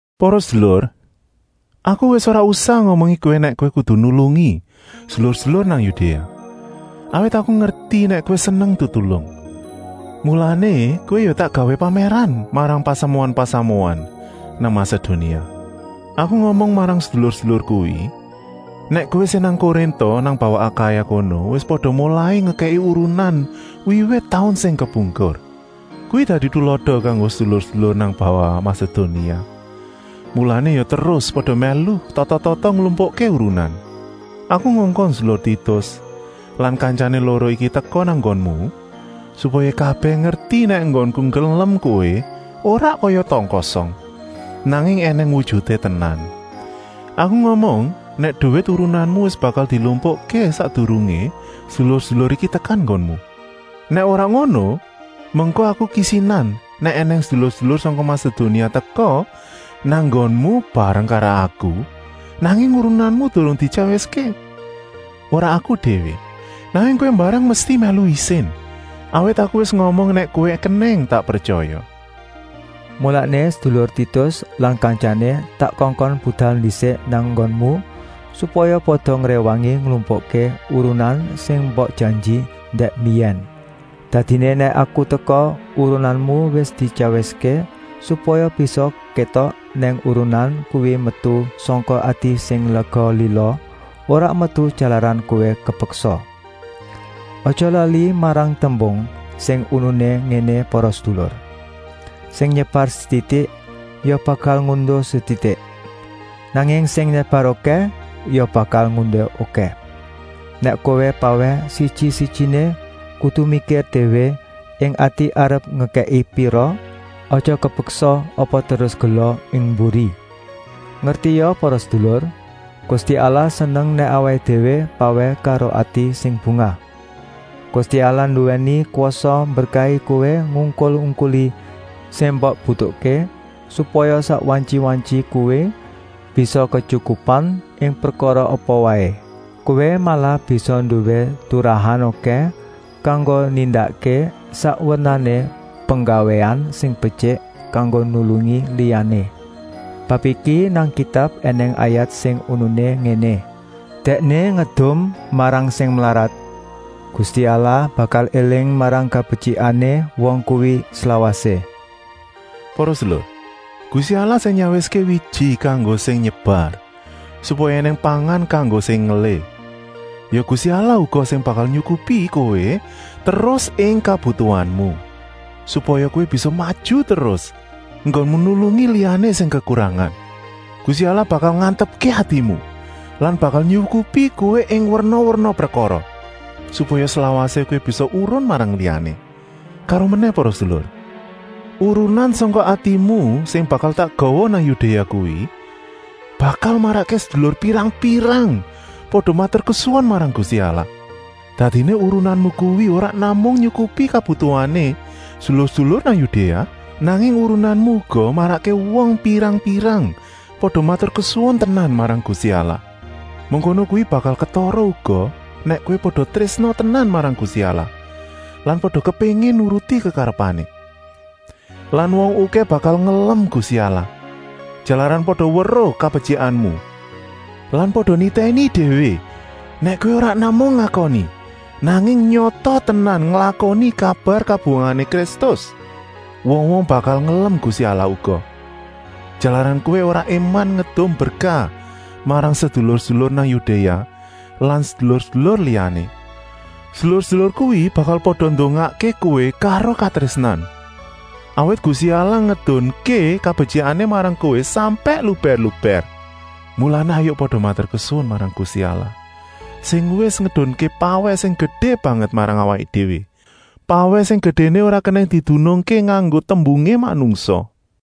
Para sedulur, aku wis ora usah ngomongi kowé nèk kowé kudu nulungi sedulur-sedulur nang Yudéa. Awit aku ngerti nèk kowé seneng tetulung, mulané kowé ya tak gawé pamèran marang pasamuan-pasamuan nang Masedonia. Aku ngomong marang sedulur-sedulur kuwi nèk kowé sing nang Korinta nang bawah Akaya kono wis pada molai ngekèki urunan wiwit taun sing kepungkur. Kuwi dadi tulada kanggo sedulur-sedulur nang bawah Masedonia, mulané ya terus pada mèlu tata-tata nglumpukké urunan. Aku ngongkon sedulur Titus lan kantyané loro iki teka nang nggonmu, supaya kabèh ngerti nèk enggonku ngelem kowé ora kaya tong-kosong, nanging ènèng wujuté tenan. Aku ngomong nèk duwit urunanmu wis bakal dilumpukké sakdurungé sedulur-sedulur iki tekan nggonmu. Nèk ora ngono, mengko aku kisinan nèk ènèng sedulur-sedulur sangka Masedonia teka nang nggonmu bareng karo aku, nanging urunanmu durung dityawiské. Ora aku déwé, nanging kowé mbarang mesti mèlu isin, awit aku wis ngomong nèk kowé kenèng tak pretyaya. Mulané sedulur Titus lan kantyané tak kongkon budal ndisik nang nggonmu, supaya pada ngréwangi nglumpukké urunan sing mbok janji dèk mbiyèn. Dadiné nèk aku teka, urunanmu wis dityawiské, supaya bisa kétok nèk urunan kuwi metu sangka ati sing lega-lila, ora metu jalaran kowé kepeksa. Aja lali marang tembung sing uniné ngéné para sedulur: “Sing nyebar setitik ya bakal ngunduh setitik, nanging sing nyebar okèh ya bakal ngunduh okèh.” Nèk kowé pawèh, siji-sijiné kudu mikir déwé ing ati arep ngekèki pira, aja kepeksa apa terus gela ing mburi. Ngertia para sedulur, Gusti Allah seneng nèk awaké déwé pawèh karo ati sing bungah. Gusti Allah nduwèni kwasa mberkahi kowé ngungkul-ungkuli sing mbok butuhké, supaya sak wantyi-wantyi kowé bisa ketyukupan ing prekara apa waé. Kowé malah bisa nduwé turahan okèh kanggo nindakké sak wernané penggawéan sing betyik kanggo nulungi liyané. Bab iki nang Kitab ènèng ayat sing uniné ngéné: “Dèkné ngedum marang sing mlarat, Gusti Allah bakal éling marang kabetyikané wong kuwi slawasé.” Para sedulur, Gusti Allah sing nyawiské wiji kanggo sing nyebar, supaya ènèng pangan kanggo sing ngelih, ya Gusti Allah uga sing bakal nyukupi kowé terus ing kabutuhanmu, supaya kowé bisa maju terus enggonmu nulungi liyané sing kekurangan. Gusti Allah bakal ngantepké atimu lan bakal nyukupi kowé ing werna-werna prekara, supaya slawasé kowé bisa urun marang liyané. Karomenèh para sedulur, urunan sangka atimu sing bakal tak gawa nang Yudéa kuwi bakal marakké sedulur pirang-pirang pada maturkesuwun marang Gusti Allah. Dadiné urunanmu kuwi ora namung nyukupi kabutuhané sedulur-sedulur nang Yudéa, nanging urunanmu uga marakké wong pirang-pirang pada maturkesuwun tenan marang Gusti Allah. Mengkono kuwi bakal ketara uga nèk kowé pada trésna tenan marang Gusti Allah lan pada kepéngin nuruti kekarepané. Lan wong okèh bakal ngelem Gusti Allah, jalaran pada weruh kabetyikanmu lan pada nitèni déwé nèk kowé ora namung ngakoni, nanging nyata tenan nglakoni kabar kabungahané Kristus. Wong-wong bakal ngelem Gusti Allah uga, jalaran kowé ora éman ngedum berkah marang sedulur-sedulur nang Yudéa lan sedulur-sedulur liyané. Sedulur-sedulur kuwi bakal pada ndongakké kowé karo katrésnan, awit Gusti Allah ngedunké kabetyikané marang kowé sampèk lubèr-lubèr. Mulané hayuk pada maturkesuwun marang Gusti Allah, sing wis ngedunké pawèh sing gedé banget marang awaké déwé, pawèh sing gedéné ora kenèng didunungké nganggo tembungé manungsa.